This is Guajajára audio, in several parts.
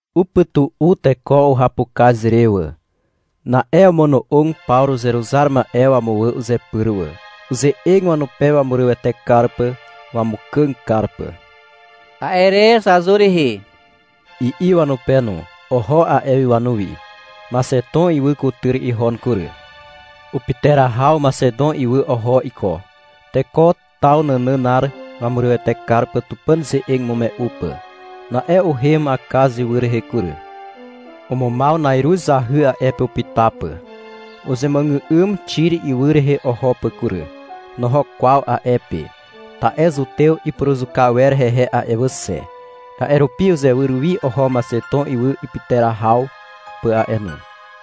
Upytu'u teko uhapukaz re wà. Na'e omono'og Pawru uzeruzar ma'e wamuwà uzepyr wà. Uze'eg wanupe wamurywete kar pà, wamukàg kar pà. A'e re — Zazur rihi, i'i wanupe no. Oho a'e wi wanuwi. Maxeton ywy kutyr ihon kury. Upyterahaw Maxeton ywy oho iko, teko taw nànànar wamurywete kar pà Tupàn ze'eg imume'u pà. Na'e uhem Akaz ywy rehe kury. Umumaw na'iruz zahy a'e pe upyta pà. Uzemuàgà'ym Xir ywy rehe oho pà kury. Noho kwaw a'e pe, ta'e zutew ipuruzuka wer hehe a'e wà xe. A'e rupi uzewyr wi oho Maxeton ywy ipyterahaw pà a'e no.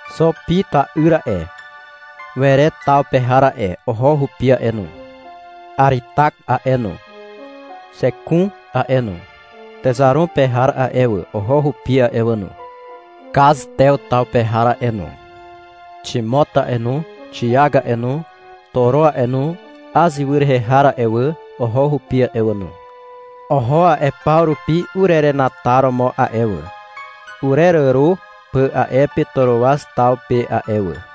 Xo Pir ta'yr a'e, Were taw pe har a'e, oho hupi a'e no. Aritak a'e no, Xekun a'e no, Texaron pe har a'e wà, oho hupi a'e wà no. Kaz Tew taw pe har a'e no, Ximot a'e no, Xik a'e no, Toro a'e no, Az ywy rehe har a'e wà, oho hupi a'e wà no. Oho a'e paw rupi urerenataromo a'e wà, ureràro pà a'e pe Toroaz taw pe a'e wà.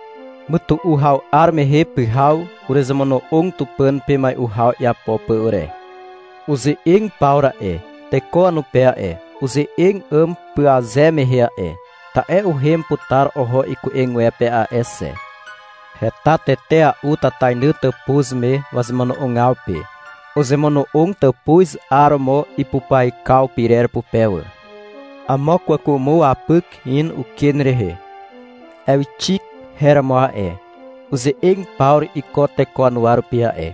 Mytu'u haw 'ar mehe pyhaw uruzemono'og Tupàn pe mai'u haw iapo pà ure. Uze'eg Pawru a'e, teko wanupe a'e. Uze'eg 'àm pyaze mehe a'e. Ta'e uhem putar oho iku'egwepe a'e xe. Heta tetea'u tatainy tàpuz me wazemono'ogaw pe. Uzemono'og tàpuz 'aromo ipupyaikaw pyrer pupe wà. Amo kwàkwàmo wapyk in uken rehe. Ewxik her romo a'e. Uze'eg Pawru iko teko wanuwa rupi a'e.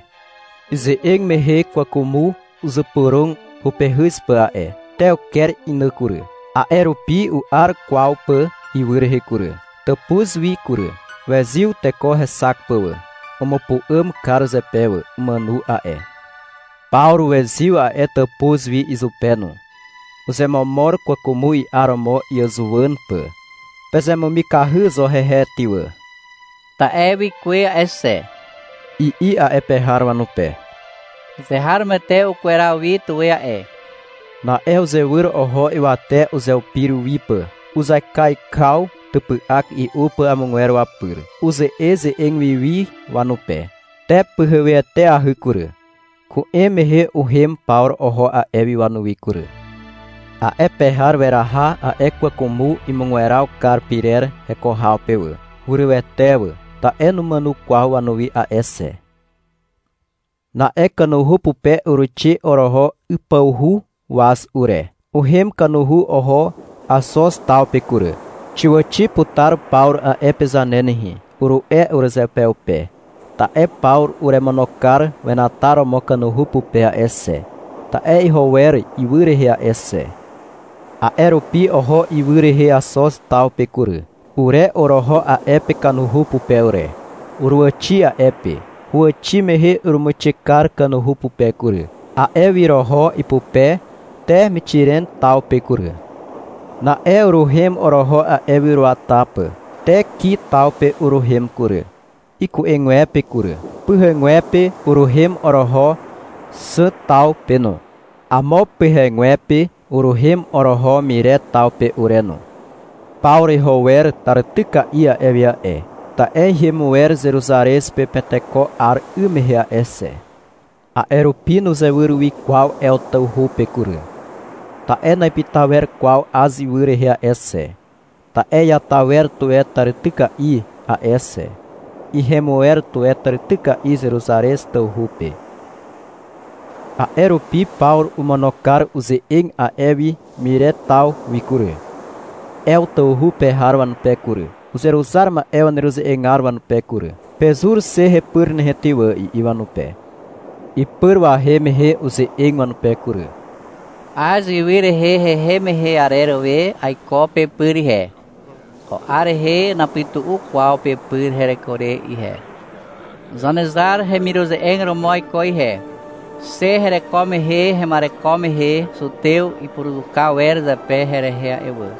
Ize'eg mehe kwàkwàmo uzypyrog hupehyz pà a'e. Te uker inà kury. A'e rupi u'ar kwaw pà ywy rehe kury, tàpuz wi kury. Wezyw teko hexak pà wà. Umupu'àm kar zepe wà. Umàno a'e. Pawru wezyw a'e tàpuz wi izupe no. Uzemomor kwàkwàmo i'aromo iàzuwàn pà. — Pezemumikahy zo hehe ty wà, ta'e wikuwe a'e xe, i'i a'e pe har wanupe. Azeharomoete ukweraw wi tuwe a'e. Na'e uzewyr oho ywate uzeupir wi pà. Uzaikaikaw typy'ak i'u pà amogwer wapyr. Uze'eze'eg wi wi wanupe. Te pyheweteahy kury. Ku'em mehe uhem Pawru oho a'e wi wanuwi kury. A'e pe har weraha a'e kwàkwàmo imugweraw kar pyrer heko haw pe wà. Hurywete wà, ta'e numàno kwaw wanuwi a'e xe. Na'e kanuhu pupe uruixe oroho ypawhu waz ure. Uhem kanuhu oho Axoz taw pe kury. — Xiàwàxi putar Pawru a'e pe zane nehe, uru'e urezeupeupe. Ta'e Pawru uremono kar wenataromo kanuhu pupe a'e xe. Ta'e iho wer ywy rehe a'e xe. A'e rupi oho ywy rehe Axoz taw pe kury. Ure oroho a'e pe kanuhu pupe ure. Uruàwàxi a'e pe. Huwàxi mehe urumuixe kar kanuhu pupe kury. A'e wi oroho ipupe te Mixiren taw pe kury. Na'e uruhem oroho a'e wi uruata pà. Te Ki taw pe uruhem kury, iku'egwepe kury. Pyhegwepe uruhem oroho Xàm taw pe no. Amo pyhegwepe uruhem oroho Mire taw pe ure no. Pawru iho wer tàrityka'i a'e wi a'e, ta'e ihem wer Zeruzarez pe Penteko 'ar 'ym mehe a'e xe. A'e rupi nuzewyr wi kwaw Ew tawhu pe kury, ta'e na'ipyta wer kwaw Az ywy rehe a'e xe, ta'e iata wer tuwe tàrityka'i a'e xe. Ihem wer tuwe tàrityka'i Zeruzarez tawhu pe. A'e rupi Pawru omono kar uze'eg a'e wi Mire taw wi kury, Ew tawhu pe har wanupe kury, uzeruzar ma'e waneruze'egar wanupe kury. — Pezur xe hepyr nehe ty wà, i'i wanupe. Ipyr wahem mehe uze'eg wanupe kury. -Az ywy rehe hehem mehe arer we aiko pepyr ihe. Ko 'ar rehe napytu'u kwaw pepyr hereko re ihe. Zanezar hemiruze'eg romo aiko ihe. Xe hereko mehe hema'ereko mehe zutew ipuruzuka wer zepe herehe a'e wà.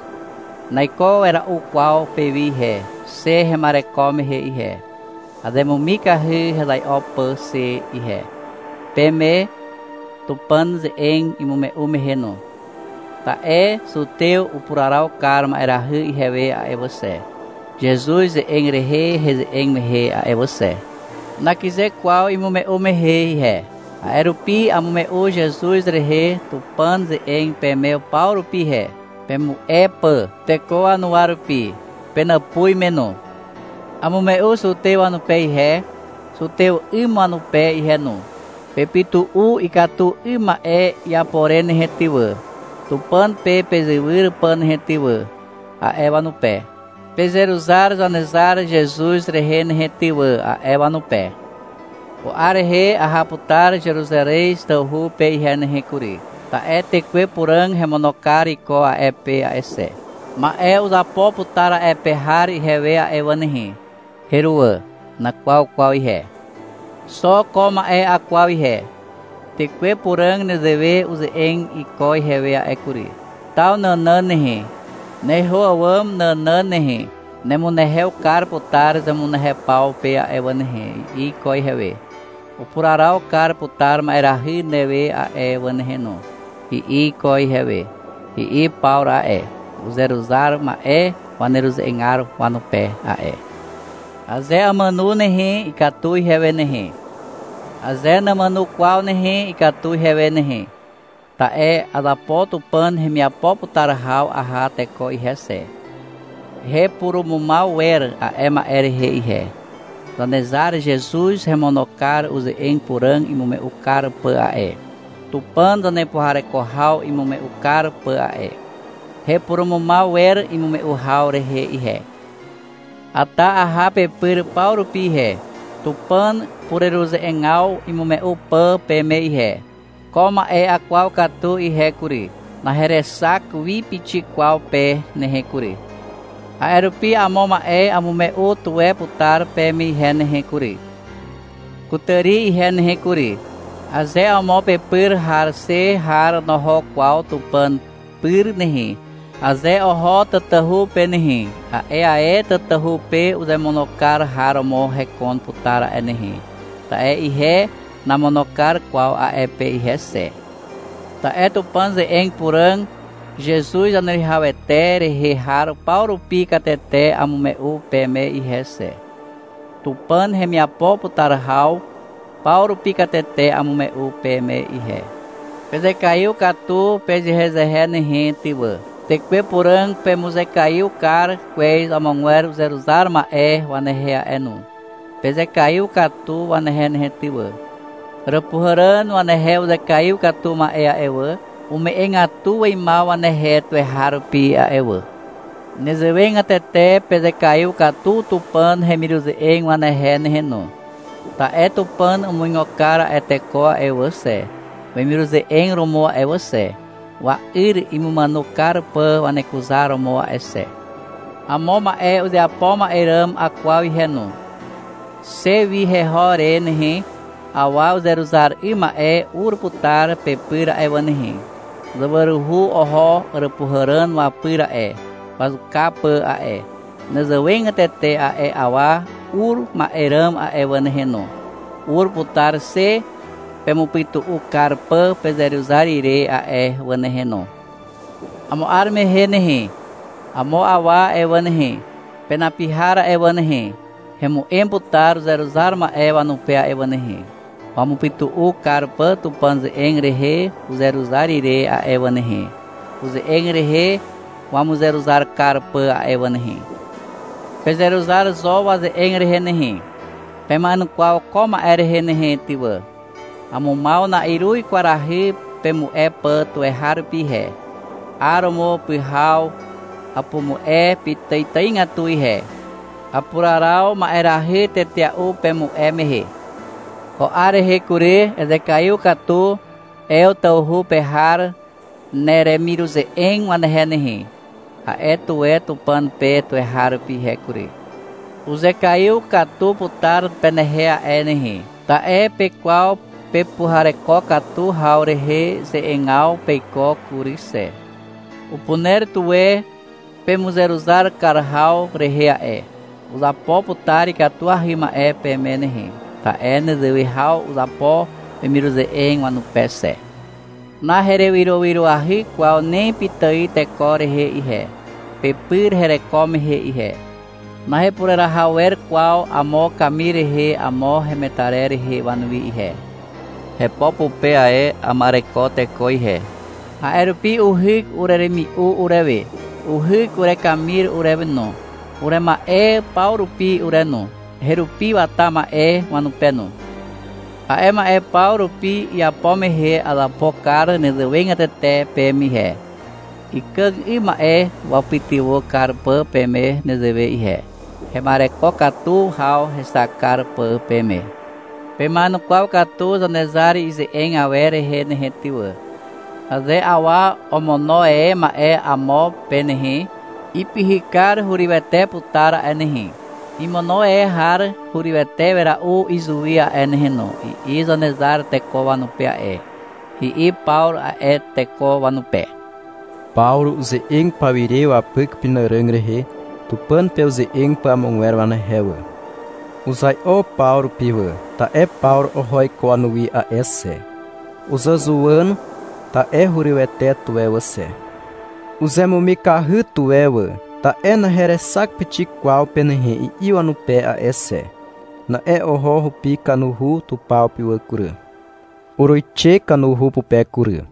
Naiko wera'u kwaw pewi ihe, xe hema'ereko mehe ihe. Azemumikahy hezai'o pà xe ihe, peme Tupàn ze'eg imume'u mehe no, ta'e zutew upuraraw kar ma'erahy ihewe a'e wà xe, Zezuz ze'eg rehe heze'eg mehe a'e wà xe. Nakyze kwaw imume'u mehe ihe. A'e rupi amume'u Zezuz rehe Tupàn ze'eg peme paw rupi ihe, pemu'e pà, teko wanuwa rupi, penàpuz me no. Amume'u zutew wanupe ihe, zutew 'ym wanupe ihe no. -Pepytu'u ikatu 'ym ma'e iapo re nehe ty wà, Tupàn pe pezewyr pà nehe ty wà, a'e wanupe. — Pezeruzar Zanezar Zezuz rehe nehe ty wà, a'e wanupe. — Ko 'ar rehe aha putar Zeruzarez tawhu pe ihe nehe kury. Ta'e Tekwe Puràg hemono kar iko a'e pe a'e xe. Ma'e uzapo putar a'e pe har ihewe a'e wà nehe. Heruwà. Nakwaw kwaw ihe. Xo ko ma'e akwaw ihe. Tekwe Puràg nezewe uze'eg iko ihewe a'e kury. — Taw nànàn nehe, neho àwàm nànàn nehe, nemunehew kar putar zemunehew paw pe a'e wà nehe, i'i iko ihewe. — Upuraraw kar putar ma'erahy newe a'e wà nehe no, i'i iko ihewe, i'i Pawru a'e, uzeruzar ma'e waneruze'egar wanupe a'e. — Aze amàno nehe, ikatu ihewe nehe. Aze namàno kwaw nehe, ikatu ihewe nehe. Ta'e azapo Tupàn hemiapo putar haw aha teko ihe xe. Hepurumumaw wer a'e ma'e rehe ihe. Zanezar Zezuz hemono kar uze'eg puràg imume'u kar pà a'e, Tupàn zanepuhareko haw imume'u kar pà a'e. Hepurumumaw wer imume'u haw rehe ihe. Ata aha pepyr paw rupi ihe, Tupàn pureruze'egaw imume'u pà peme ihe. Ko ma'e akwaw katu ihe kury. Naherexak wi pixik kwaw pe nehe kury. A'e rupi amo ma'e amume'u tuwe putar peme ihe nehe kury, kutàri ihe nehe kury. — Aze amo pepyr har xe har noho kwaw Tupàn pyr nehe, aze oho tatahu pe nehe, a'e ae tatahu pe uzemono kar har romo hekon putar a'e nehe. Ta'e ihe namono kar kwaw a'e pe ihe xe. Ta'e Tupàn ze'eg puràg Zezuz Zaneruwihawete rehe har paw rupi katete amume'u peme ihe xe. Tupàn hemiapo putar haw paw rupi katete amume'u peme ihe. Pezekaiw katu pezehezehe nehe ty wà. Tekwe Puràg pemuzekaiw kar kwez amogwer uzeruzar ma'e wanehe a'e no. Pezekaiw katu wanehe nehe ty wà. Àràpuhàràn wanehe uzekaiw katu ma'e a'e wà, ume'egatu weimaw wanehe tuweharupi a'e wà. Nezewegatete pezekaiw katu Tupàn hemiruze'eg wanehe nehe no. Ta'e Tupàn umuigo kar a'e teko a'e wà xe, wemiruze'eg romo a'e wà xe, wa'yr imumàno kar pà wanekuzaromo a'e xe. Amo ma'e uzeapo ma'e ràm akwaw ihe no. Xe wi heho re nehe, awa uzeruzar 'ym ma'e ur putar pepyr a'e wà nehe. Zawaruhu oho àràpuhàràn wapyr a'e, wazuka pà a'e. Nezewegatete a'e awa ur ma'e ràm a'e wà nehe no, ur putar xe pemupytu'u kar pà pezeruzar ire a'e wà nehe no. Amo 'ar mehe nehe, amo awa a'e wà nehe, penapi har a'e wà nehe, hemu'em putar uzeruzar ma'e wanupe a'e wà nehe, wamupytu'u kar pà Tupàn ze'eg rehe uzeruzar ire a'e wà nehe, uze'eg rehe wamuzeruzar kar pà a'e wà nehe. Pezeruzar zo waze'eg rehe nehe. Pema'enukwaw ko ma'e rehe nehe ty wà. Amumaw na'iruz kwarahy pemu'e pà tuweharupi ihe. 'Aromo, pyhaw, apumu'e pitàitàigatu ihe. Apuraraw ma'erahy tetea'u pemu'e mehe. Ko 'ar rehe kury, — Ezekaiw katu Ew tawhu pe har neremiruze'eg wanehe nehe, a'e tuwe Tupàn pe tuweharupi ihe kury. Uzekaiw katu putar penehe a'e nehe, ta'e pekwaw pepuhareko katu haw rehe ze'egaw peiko kury xe. Upuner tuwe pemuzeruzar kar haw rehe a'e. Uzapo putar ikatuahy ma'e peme nehe, ta'e nezewe haw uzapo wemiruze'eg wanupe xe. Naherewyrowyroahy kwaw ni pitài teko rehe ihe, pepyr hereko mehe ihe. Nahepureraha wer kwaw amo kamir rehe amo hemetarer rehe wanuwi ihe. Hepo pupe ae ama'ereko teko ihe. A'e rupi uhyk ureremi'u urewe. Uhyk urekamir urewe no, urema'e paw rupi ure no, herupi wata ma'e wanupe no. A'e ma'e paw rupi iapo mehe azapo kar nezewegatete peme ihe, ikàg 'ym ma'e wapytywà kar pà peme nezewe ihe, hema'ereko katu haw hexak kar pà peme. Pema'enukwaw katu Zanezar ize'eg awer rehe ty wà. — Aze awa omono e ma'e amo pe nehe, ipyhykar hurywete putar a'e nehe. Imono e har hurywete wera'u izuwi a'e nehe no, i'i Zanezar teko wanupe a'e, i'i Pawru a'e teko wanupe. Pawru uze'eg pawire wapyk upenàràg rehe, Tupàn pe uze'eg pà amogwer wanehe wà. Uzai'o paw rupi wà, ta'e Pawru oho iko wanuwi a'e xe. Uzàzuwàn, ta'e hurywete tuwe wà xe. Uzemumikahy tuwe wà, ta'e — Naherexak pixik kwaw pe nehe, i'i wanupe a'e xe. Na'e oho hupi kanuhu tupaw pe wà kury. Uruixe kanuhu pupe kury.